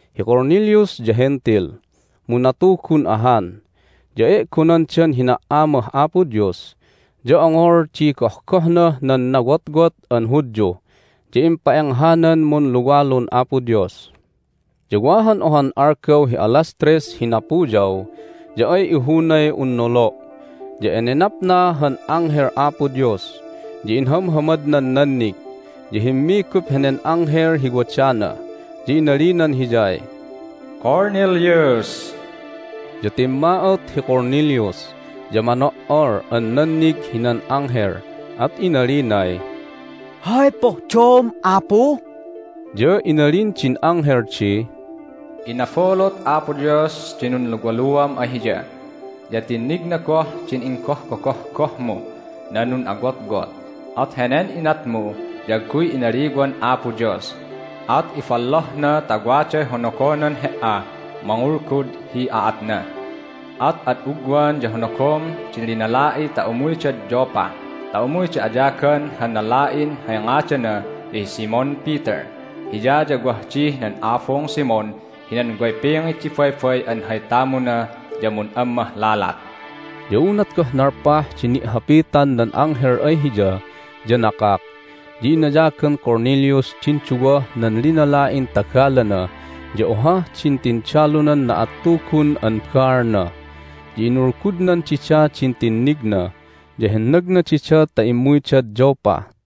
Hi Cornelius ya Hentil, mu natugun ahan, ya e'gonandan hina"amah Apo Dios, ya ongol di gohgohnah nan nawotwot an Hudyu, ya impa'enghanan munluwalun Apo Dios. Ya wa han ohan algaw hi alas tres hi napuyaw ya ay ihunay un nolo', ya enenapna han anghel Apo Dios. Ya inhamhamadnan nannig, ya himmigup henen anghel hi wadana, ya inalinan hiyay, "Cornelius!" Ya timma'ot hi Cornelius, ya mano"ol an nannig hinan anghel, at inalinay, "Hay pohdom, Apu?" Ya inalin din anghel di, "Inabulut Apo Dios din nunluwaluam ay Hiya, ya tinnigna goh din inggohgogohgohmuh nan nun'awotwot. At henen inatmu ya agguy inaliwan Apo Dios, at ibollohna ta waday honogonan he"ah mangulgud hi aatna. At ad ugwan ya honogom di linala'i ta umuydad Joppa ta umuyda ayagan han lala'in hay ngadana ya hi Simon Peter. Hiya ya wah dih nan abung Simon hinan way pingit di baybay an hay tamuna ya mun'ammah lalat." Ya unat goh nalpah di ni'hapitan nan anghel ay hiya ya nakak. Ya inayagan Cornelius din duwah nan linala'in tagalana ya ohah din tindalunan na'attugun an baalna. Ya inulgudnan dida din tinnigna, ya hennagna dida ta immuydad Joppa.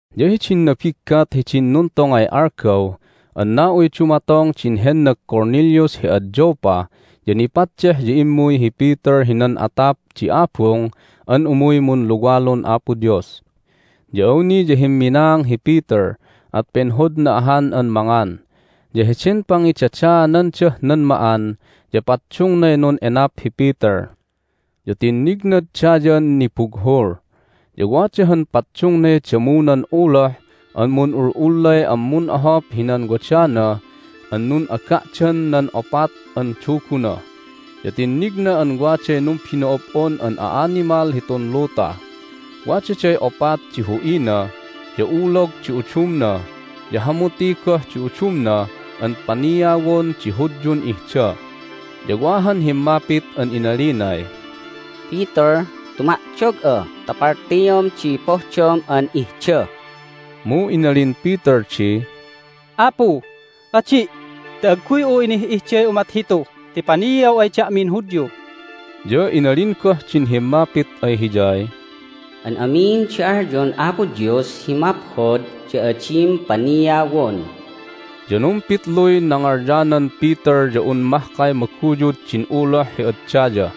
Ya hidin nabiggat hidin nuntongay algaw an na'uy dumatong din hennag Cornelius hi ad Joppa ya nipaddeh ya immuy hi Peter hinan atap di abung an umuy munluwalun Apo Dios. Ya awni ya himminaang hi Peter, at penhodna ahan an mangan. Ya heden pangidadaanandah nan ma'an ya paddungnay nun'enap hi Peter. Ya tinnignad dayan nibughul, ya wada han paddungnay damunan uloh an mun'ul'ullay an mun'ohop hinan wadana an nun'aga'dan nan opat an duguna. Ya tinnigna an waday numbino'ob'on an a'animal hitun luta. Wadaday opat di hu'ina, ya ulog di udumna, ya hamuti goh di udumna an paniawon di Hudyun ihda. Ya wa han himmapit an inalinay, "Peter, tuma'dog'a ta paltiom di pohdom an ihda!" Mu inalin Peter di, "Apu, adi'! Ti agguy'u inih'ihday umat hitu ti paniaw ay da'min Hudyu!" Ya inalin goh din himmapit ay hiyay, "An amin di alyon Apo Dios hi maphod ya adim paniawon." Ya numpitluy nangalyanan Peter ya un mahkay maguyud din uloh hi ad daya.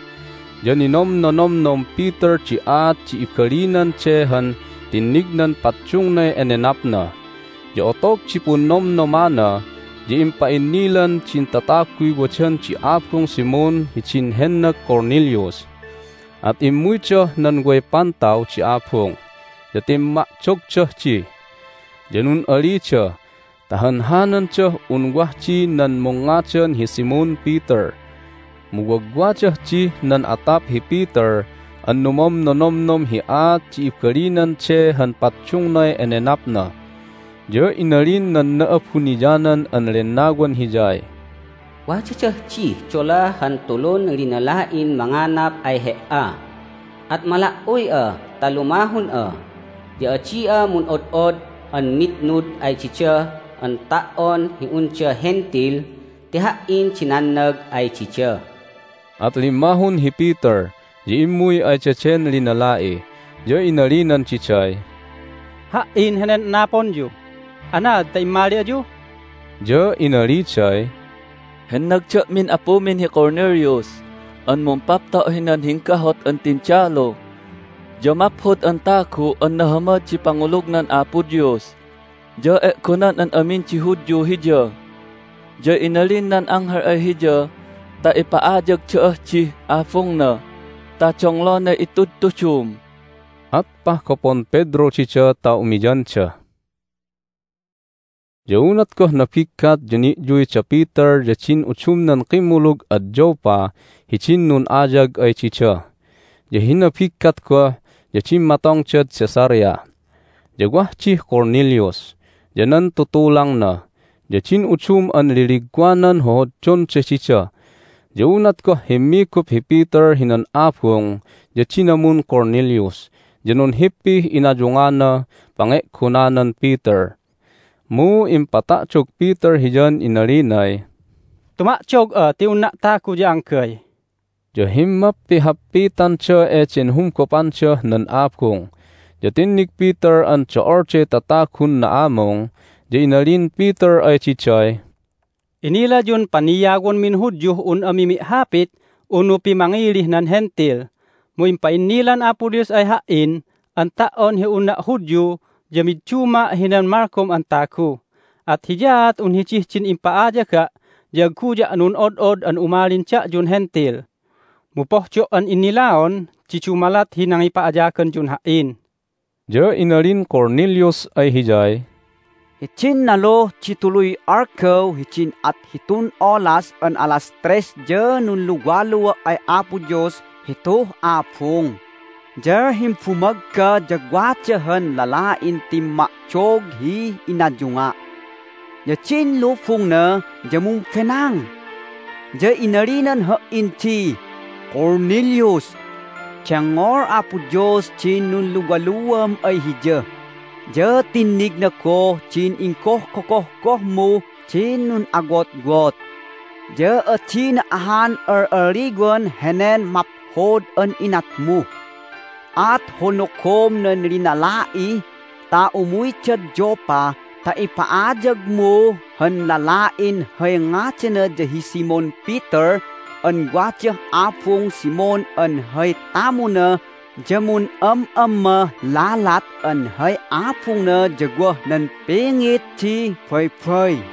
Ya ninomnonomnom Peter di aat di ibalinan de han tinnignan paddungnay enenapna. Ya otog di punnomnomana ya impa'innilan din tataguy wadan di abung Simon hidin hennag Cornelius, at immuydah nan way pantaw di abung, ya timma'dogdah di. Ya nun'alida ta hanhanandah un wah di nan mungngadan hi Simon Peter. Mu wagwadah dih nan atap hi Peter an numomnonomnom hi aat di ibalinan de han paddungnay enenapna. Ya inalin nan Na'abuniyanan an Lennawan hiyay, "Wadadah dih dola han tulun linala'in manganap ay he"a. At mala"uy'a ta lumahun'a. Ya adi'a mun'od'od an mitnud ay dida an ta"on hi unda Hentil ti Ha"in di nannag ay dida." At limmahun hi Peter, ya immuy ay daden linala'i, ya inalinan diday, "Ha"in henen anaponyu. Anaad ta immali ayu?" Ya inaliday, "Hennag da'min apumin hi Cornelius an mumpapto' hinan hinggahut an tindalu, ya maphod an tagu an nahamad di pangulugnan Apo Dios, ya e'gonan an amin di Hudyu hiya. Ya inalin nan anghel ay hiya ta ipa'ayag da'ah dih abungna ta donglonay itudtudum." At pahgopon Pedro dida ta umiyanda. Ya unat goh nabiggat ya ni'yuy da Peter ya din udumnan kimmulug ad Joppa hidin nun'ayag ay dida. Ya hi nabiggat goh ya dimmatongdad Caesarea. Ya wah dih Cornelius, ya nan tutulangna, ya din udum an liligwanan hohoddonda dida. Ya unat goh himmigup hi Peter hinan abung ya dinamun Cornelius, ya nunhippih inayunganah pange'gonanan Peter. Mu impata'dog Peter hiyan inalinay, "Tuma'dog'a ti unna' tagu ya anggay!" Ya himmappihappitanda eden humgopandah nan abung, ya tinnig Peter an do'olday tatagun na'amung. Ya inalin Peter ay diday, "Inilayun paniawonmin Hudyuh un ami mi'hapit unu pimangilih nan Hentil. Mu impa'innilan Apo Dios ay ha"in an ta"on hi unna' Hudyu ya midduma' hinan malgom an tagu. At hiyaat un hidih din impa'ayaga' ya agguya' nun'od'od an umalin da'yun Hentil. Mu pohdo' an innilaon di dumalat hi nangipa'ayaganyun ha"in." Ya inalin Cornelius ay hiyay, "Hidin naluh di tuluy algaw hidin at hitun olas an alas tres ya nunluwalua' ay Apo Dios hituh abung. Ya himbumagga ya wada han lala'in timma'dog hi inayunga', ya din lubungna ya mumbenang. Ya inalinan ha"in di, Cornelius! Dengngol Apo Dios din nunluwaluam ay Hiya, ya tinnigna goh din inggohgogohgohmuh din nun'awotwot, ya adina ahan al'alliwan henen maphod an inatmu. At honogom nan linala'i ta umuydad Joppa ta ipa'ayagmu han lala'in hay ngadana ya hi Simon Peter an wadah abung Simon an hay tamuna ya mun'am'ammah lalat an hay abungna ya wah nan pingit di baybay.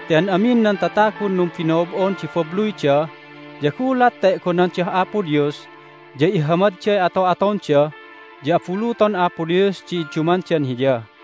Ti an amin nan tatagun numbino'ob'on di babluyda ya gulat ta e'gonandah Apo Dios ya ihamadday ato'atonda ya abuluton Apo Dios di iddumandan Hiya!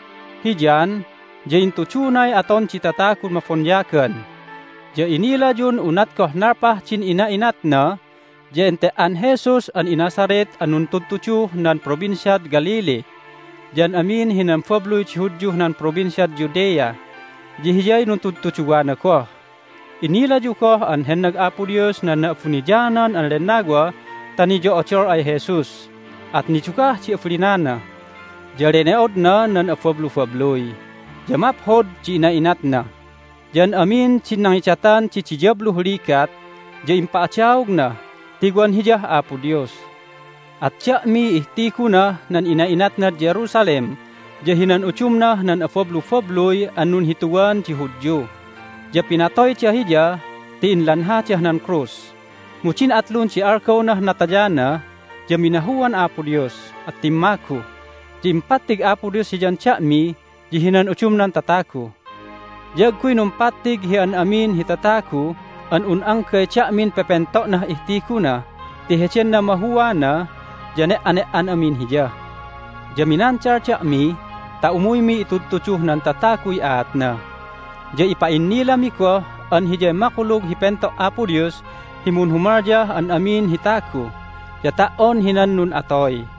Hi John ya intudunay aton di tatagun mabonyagan, ya inilayun unat goh nalpah din ina'inatna ya ente"an Jesus an iNazareth an nuntudtuduh nan Provinciad Galilee, ya an amin hinan babluy di Hudyuh nan Provinciad Judea ya hiyay nuntudtuduwana goh. Inilayu goh an hennag Apo Dios nan Na'abuniyanan an Lennawa ta niyo'odol ay Jesus, at nidugah di abalinana. Ya lene'odna nan abablubabluy, ya maphod di ina'inatna, ya an amin din nangidatan di diyabluh ligat ya impa'adaogna ti wan Hiyah Apo Dios. At da'miy ihtigunah nan ina'inatnad Jerusalem ya hinan udumnah nan abablubabluy an nunhituwan di Hudyu. Ya pinatoyda Hiya ti inlanhadah nan krus. Mu din atlun di algawnah natayana ya minahuan Apo Dios, at timmagu. Ya impattig Apo Dios Hiyan da'mi ya hinan udumnan tatagu. Ya agguy numpattig hi an amin hi tatagu an un anggay da'min pepento'nah ihtiguna ti heden namahuana ya ne"ane"an amin Hiya. Ya minandal da'mi ta umuymi itudtuduh nan tataguy aatna, ya ipa'innilami goh an Hiyay makulug hi pento' Apo Dios hi munhumalyah an amin hi tagu, ya ta"on un hinan nun'atoy.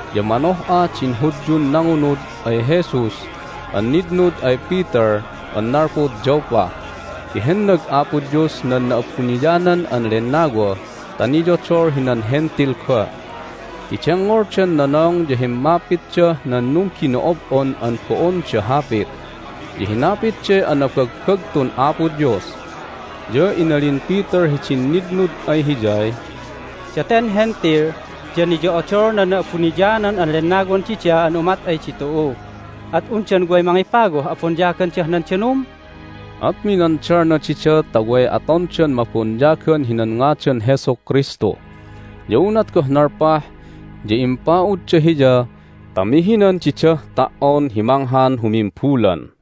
Ya manoh'a din Hudyun nangunud ay Jesus an nitnud ay Peter an nalpud Joppa, ti hennag Apo Dios nan Na'abuniyanan an Lennawa ta niyodol hinan Hentil goh ti dengngoldan nonong ya himmapitdah nan numbino'ob'on an bo'onda hapit, ya hinapitday anabagbagtun Apo Dios. Ya inalin Peter hidin nitnud ay hiyay, "Daten Hentil ya niyo'odol nan Na'abuniyanan an Lennawan dida an umat ay ditu'u! At undan way mangipawah abonyagandah nan danum?" At minandalna dida ta way atondan mabonyagan hinan ngadan Jesu Kristu. Ya unat goh nalpah ya impa'udda hiya ta mihinan didah ta"on hi manghan humimbulan.